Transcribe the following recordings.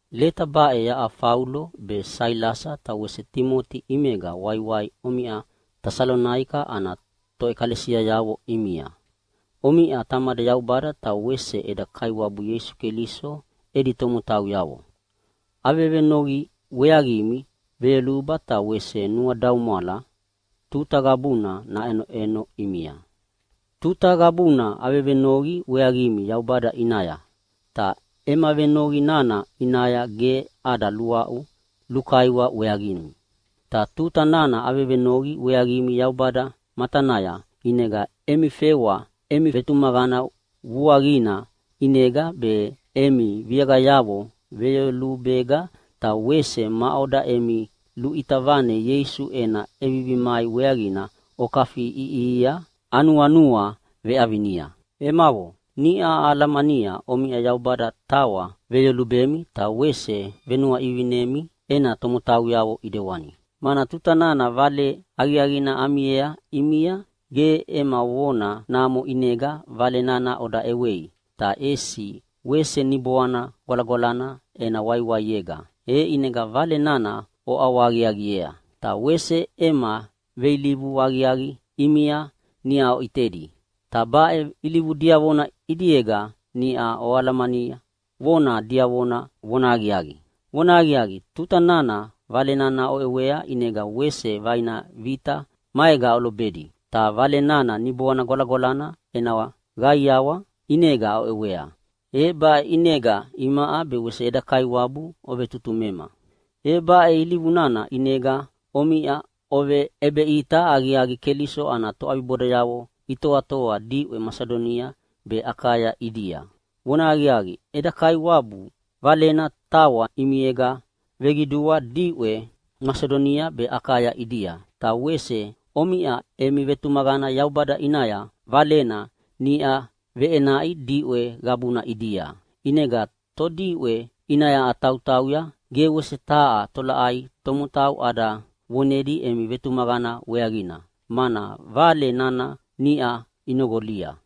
Leta baʼe yaʼa Faulo be Sailasa ta wese Timoti ʼimega waiwai omiʼa Tesalonaika ana toʼekalesiayavo ʼimia. Omiʼa Tamada Yaubada ta wese eda Kaiwabu Ieisu Keliso edi tomotauyavo. Avevenoqi weaqimi veyoluba ta wese nuadaumwala tuta qabuna naʼenoʼeno ʼimia. Tuta qabuna avevenoqi weaqimi Yaubada ʼinaya, ta ema venoqi nana ʼinaya ge ada luaʼu lukaiwa weaqimi. Ta tuta nana avevenoqi weaqimi Yaubada matanaya ʼinega emi fewa emi vetumaqana vuaqina ʼinega be, emi viaqayavo veyolubega ta wese maʼoda emi luʼita vane Ieisu ena ʼevivi mai weaqina okafiʼiʼihia anuanua veʼavinia. Emavo, niʼa ahalamania omiʼa Yaubada tawa veyolubemi ta wese venuaʼivinimi ena tomotauyavo ʼidewani. Mana tuta nana Vale Aqiaqina amiea ʼimia ge ema vona namo ʼinega Vale nana oda ʼewei, ta ʼesi wese Niboana Gwalagwalana ena waiwaiega, e ʼinega Vale nana oʼawahaqiaqiea. Ta wese ema veilivu aqiaqi ʼimia niʼa oʼitedi, ta baʼe ilivu diavona ʼidiega niʼa oalamania vona diavona vonahaqiaqi. Vonahaqiaqi, tuta nana Vale nana oʼewea ʼinega wese vaina vita maega olobedi, ta Vale nana Niboana Gwalagwalana ena qaiawa ʼinega oʼewea, e baʼe ʼinega imaʼa be wese eda Kaiwabu ovetutumema. E baʼe ilivu nana ʼinega omiʼa oveʼebeʼita aqiaqi Keliso ana toʼabibodayavo itoatoa diʼwe Masidonia be Akaya ʼidia. Vonahaqiaqi, eda Kaiwabu Valena tawa ʼimiega veqidua diʼwe Masidonia be Akaya ʼidia, ta wese omiʼa emi vetumaqana Yaubada ʼinaya Valena niʼa veʼenaʼi diʼwe qabuna ʼidia. ʼInegana todiʼwe ʼinaya atautauya ge wese taha tolaʼai tomotau ada vonedi emi vetumaqana weaqina, mana vale nana niʼa inoqolia.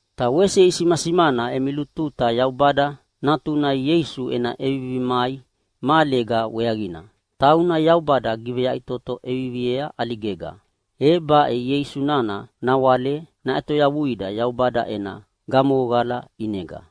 Ta wese isimasimana emi lututa Yaubada Natuna Ieisu ena ʼevivi mai mahalega weaqina, tauna Yaubada giveyaʼitoto ʼeviviea ʼaligega. E baʼe Ieisu nana nawale naʼetoyavuida Yaubada ena gamohoqala ʼinega.